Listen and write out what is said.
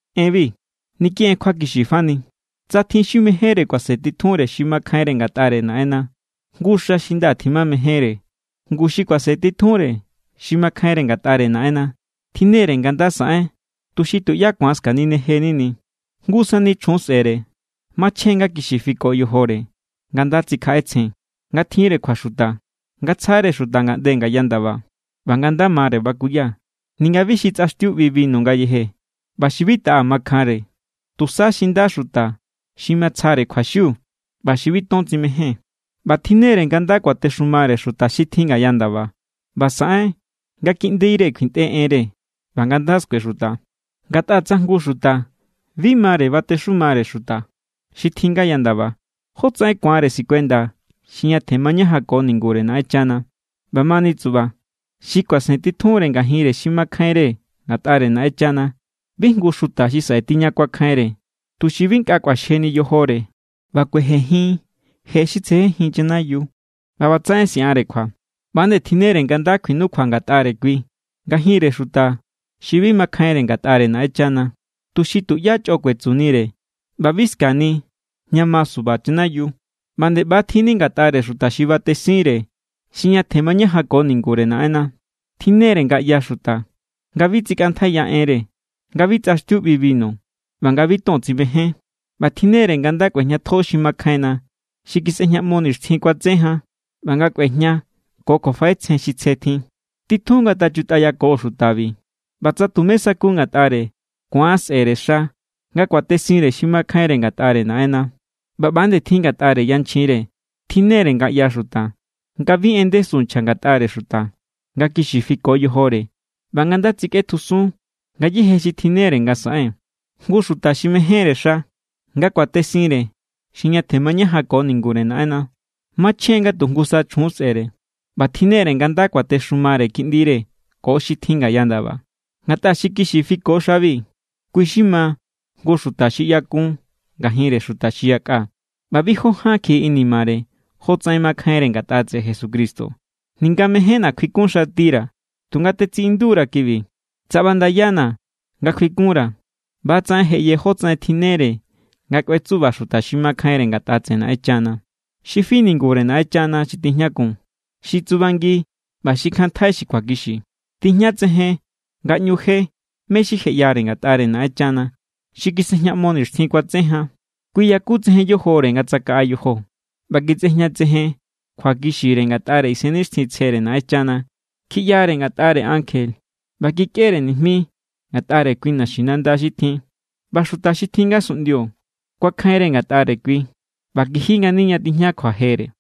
Enbi, niki en kjuakixi fani. Tsa tjin xi mejénre kuasentitjunre xi makjainre ngatꞌare Naꞌenna, jngu xa xi nda tjimamejénre. Ngu xi kuasentitjunre xi makjainre ngatꞌare Naꞌenna tjinne=re nga nda saꞌen tuxi tuꞌyá ku̱an skaninejeni. Jngu sani chjun sꞌe̱re. Machjen= nga kixi fiko yojore, nga nda tsikjaꞌetsjen, nga tjinre kjuaxuta, nga tsjare xuta ngaꞌnde ngaya ndaba, ꞌba nga nda mare bakuya. Ninga bi xi tsꞌaxtiu ꞌbi binu ngayeje, ꞌba xi bi taꞌa makjanre, tusa xi nda xuta xi matsjare kjuaxiu ꞌba xi bi ton tsimején. ꞌBa tjinne=re nga nda kuatexumare xuta xi tjin ngaya ndaba ꞌba saꞌen nga kiꞌndire kjuintꞌe enre ꞌba nga nda skuexuta. Ngatꞌa tsa jngu xuta bi mare batexumare xuta xi tjin ngaya ndaba, ¿jótsaꞌen ku̱anre sikuenda xi ñatjen mañajanko ningure Naꞌenchana? ꞌBamani tsuꞌba, xi kuasentitjunre ngajinre xi makjainre ngatꞌare Naꞌenchana bi jngu xuta xi saꞌe tiña kuakjainre, tuxi bi nkꞌa kꞌuaxjeni yojore ꞌba kuejenjin je xi tsejenjin chanayiu ꞌba ꞌbatsaꞌen siꞌanre kjua. ꞌBa=nde tjinnere nga nda kjuinukjua ngatꞌare kui ngajinre xuta xi bi makjainre ngatꞌare Naꞌenchana, tuxi tuꞌyá chꞌo kuetsunire ꞌba bi ska̱ni ña ma suba chanayiu. ꞌBa ꞌba=nde tjin ngatꞌare xuta xi batesinre xi ñatjen mañajanko ningure Naꞌenna. Tjinne=re nga ꞌyaxuta, nga bi tsikꞌantjaiya enre, nga bi tsꞌaxtiu ꞌbi binu, ꞌba nga bi ton tsimején. ꞌBa tjinnere nga nda kꞌuejñatjo xi makjainna, xi kisꞌejñaꞌmo nixtjin kuatse jan, ꞌba nga kꞌuejña ko kjuafaꞌetsjen xi tsje tjin. Titjun ngatachutꞌayako xutabi. ꞌBa tsa tumé sa̱ku ngatꞌare, ku̱an sꞌe̱re xa nga kuatesinre xi makjainre ngatꞌare Naꞌenna. ꞌBa ꞌba=nde tjin ngatꞌare yanchjinre. Tjinnere nga ꞌyaxuta, nga bi en ndesu nchja ngatꞌare xuta, nga kixi fiko yojore, ꞌba nga nda tsikꞌetjusun ngayéje xi tjinnere nga saꞌen. Jngu xuta xi mejénre xa nga kuatesinre xi ñatjen mañajanko ningure Naꞌenna, machjen= nga tu jngusa chjun sꞌe̱re. ꞌBa tjinnere nga nda kuatexumare kiꞌndire ko xi tjin ngaya ndaba. Ngatꞌa xi kixi fiko xabi, kui= xi ma jngu xuta xi ꞌyakun ngajinre xuta xi yakꞌa ꞌba bi jó ján kjiꞌi inimare jotsaꞌen makjainre ngatꞌa tseꞌe Jesucristo. Ninga mejénna̱ kjuikunxatira̱, tunga tetsiꞌindura̱ kibi. Tsa ꞌbandayana̱ nga kjuikunra̱, ꞌbatsaꞌen je ꞌye jótsaꞌen tjinnere nga kꞌuetsuba xuta xi makjainre ngatꞌare Naꞌenchana. Xi fi ningure Naꞌenchana xi tijñakun, xi tsubangi ꞌba xi kjanntjai xi kjuakixi. Tijñatsejen nga ꞌñu je mé= xi je ꞌyare ngatꞌare Naꞌenchana, xi kisꞌejñaꞌmo nixtjin kuatse jan. Kui yakutsejen yojore nga tsakaꞌa yojo, ꞌba kisꞌejñatsejen kjuakixire ngatꞌare Isennixtjintsjere Naꞌenchana. Kjiꞌyare ngatꞌare ankje, ꞌba kikꞌere nijmi ngatꞌare kui naxinanda xi tjin. ꞌBa xuta xi tjin ngasunꞌndio kuakjainre ngatꞌare kui, ꞌba kiji ngani ña tijña kjuajere.